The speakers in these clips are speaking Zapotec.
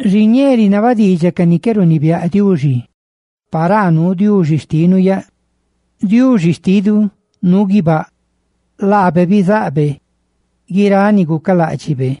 Xiñee rinaba diidxaꞌ ca ni qué runibiáꞌ Diuxi paraa nuu Diuxi xtinu yaꞌ. Diuxi xtinu nuu guibáꞌ; laabe bizaꞌbe guiráꞌ ni gucaláꞌdxibe.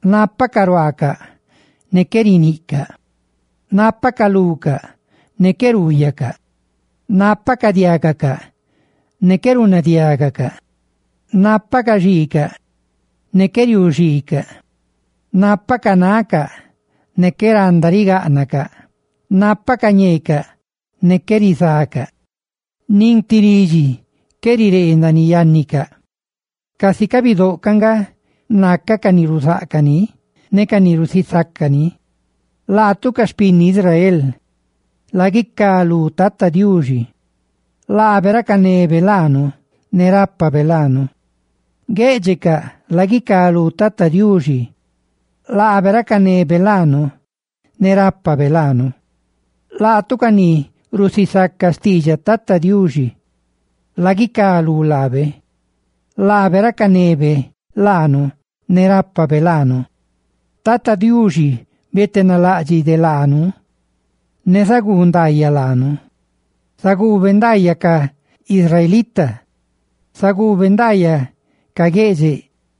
nápacaꞌ ruaacaꞌ, ne qué riniꞌcaꞌ; nápacaꞌ lucaꞌ, ne qué ruuyacaꞌ; nápacaꞌ diágacaꞌ, ne qué runadiágacaꞌ; nápacaꞌ xiicaꞌ, ne qué riuuxiicaꞌ; nápacaꞌ nacaꞌ, ne qué randa rigáꞌnacaꞌ; nápacaꞌ ñeecaꞌ, ne qué rizacaꞌ; ¡nin ti ridxi qué riree ndaaniꞌ yánnicaꞌ! Casi ca bidóꞌ ca nga naca ca ni ruzáꞌcaꞌ ni ne ca ni rusisaca ni. Laatu ca xpinni Israel, ¡laguicá lú Tata Diuxi! Laabe racanebe laanu ne rápabe laanu. Guéꞌdxecaꞌ, ¡laguicá lú Tata Diuxi! Laabe racanebe laanu ne rápabe laanu. Laatu ca ni rusisaca xtiidxaꞌ Tata Diuxi, ¡laguicá lú laabe! Laabe racanebe laanu ne rápabe laanu. ¡Tata Diuxi beedasilú laa de laanu, ne riguu ndaayaꞌ laanu! Zaguube ndaayaꞌ ca israelita, zaguube ndaayaꞌ ca gueꞌdxeꞌ,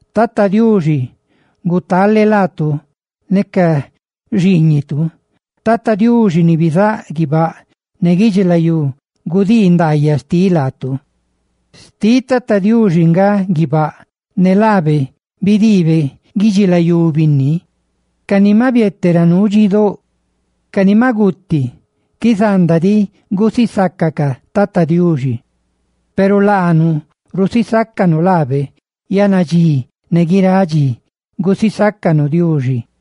¡Tata Diuxi gutale laatu, laatu ne ca xiiñitu! ¡Tata Diuxi, ni bizáꞌ guibáꞌ ne guidxilayú, cuꞌ ndaayaꞌ laatu! Xtiꞌ Tata Diuxi nga guibáꞌ, ne laabe bidiibe guidxilayú binni. Ca ni maꞌ biete ra nuu dxidóꞌ, ca ni maꞌ guti, qué zanda diꞌ gusisácacaꞌ Tata Diuxi, peru laanu susisácanu laabe yannadxí ne guiráꞌ dxi. ¡Guisaca Diuxi!